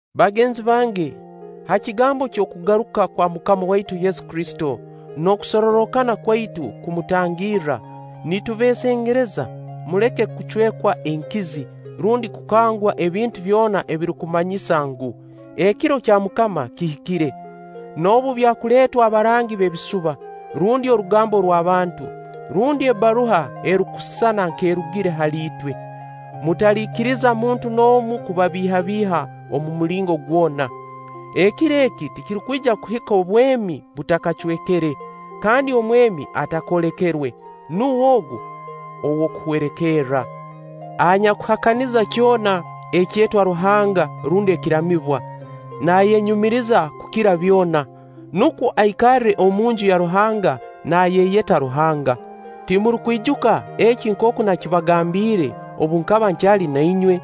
Bagenzi bange, ha kigambo eky'okugaruka kwa MUKAMA waitu Yesu Kristo n'okusorrokana kwaitu kumutangirra, nitubeesengereza muleke kucwekwa enkizi rundi kukangwa ebintu byona ebirukumanyisa ngu, ekiro kya MUKAMA kihikire; noobu byakuleetwa abarangi b'ebisuba, rundi orugambo rw'abantu, rundi ebbaruha erukusisana nk'erugire hali itwe. Mutaliikiriza muntu n'omu kubabiihabiiha omu mulingo gwona. Ekiro eki tikirukwija kuhika obwemi butakacwekere, kandi Omwemi atakoolekerwe. Nuwe ogu ow'okuhwerekerra, anyakuhakaniza kyona ekyetwa ruhanga rundi ekiramibwa. Naayenyumiriza kukira byona, nukwo aikarre omunju ya Ruhanga naayeyeta Ruhanga. Timurukwijuka eki nkooku nakibagambiire obu nkaba nkyali na inywe?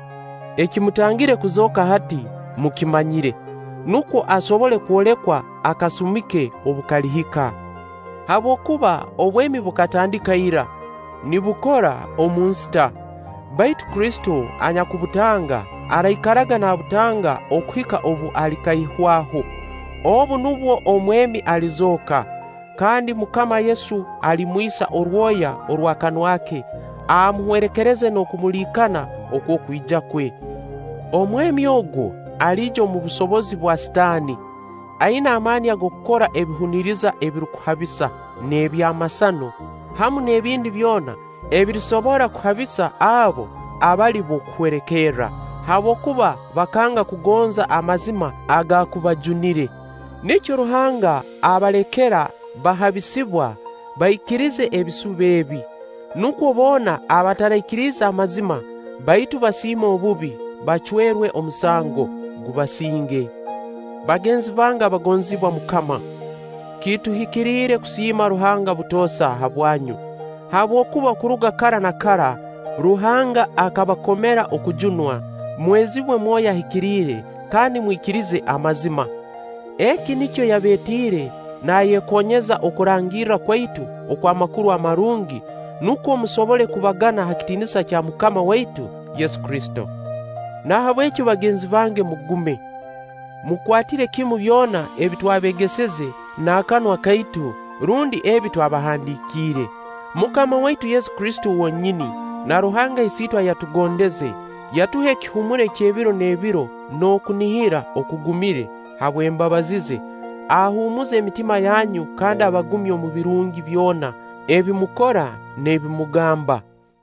Ekimutangire kuzooka hati, mukimanyire; nukwo asobole kwolekwa akasumi ke obu kalihika. Habwokuba obwemi bukatandika ira, nibukora omu nsita; baitu Kristo anyakubutanga, araikaraga naabutanga okuhika obu alikaihwaho. Obu nubwo Omwemi alizooka, kandi MUKAMA Yesu alimwisa orwoya orw'akanwa ke, amuhwerekereze n'okumuliikana okw'okwija kwe. Omwemi ogu aliija omu busobozi bwa Sitaani, aina amaani ag'okukora ebihuniriza ebirukuhabisa, n'ebyamasano, hamu n'ebindi byona ebirisobora kuhabisa abo abali b'okuhwerekerra, habwokuba bakanga kugonza amazima agaakubajunire. Nikyo Ruhanga abalekera bahabisibwa, baikirize ebisuba ebi. Nukwo boona abataraikiriize amazima, baitu baasiima obubi, bacwerwe omusango, gubasinge. Bagenzi bange abagonzibwa MUKAMA, kituhikiriire kusiima Ruhanga butoosa habwanyu, habwokuba okuruga kara na kara Ruhanga akabakomera okujunwa, mwezibwe Mwoyo Ahikiriire kandi mwikirize amazima. Eki nikyo yabeetiire naayekoonyeza okurangirra kwaitu okw'Amakuru Amarungi, nukwo musobole kubagana ha kitiinisa kya MUKAMA waitu Yesu Kristo. Nahabweki bagenzi bange mugume, mukwatire kimu byona ebi twabeegeseze na kanwa kaitu rundi ebi twabahandiikiire. MUKAMA waitu Yesu Kristo wonyini, na Ruhanga Isiitwe ayatugondeze, yatuha ekihuumuro eky'ebiro n'ebiro n'okunihira okugumire habw'embabazi ze, ahuumuze emitima yanyu kandi abagumye omu birungi byona ebi mukora n'ebi mugamba.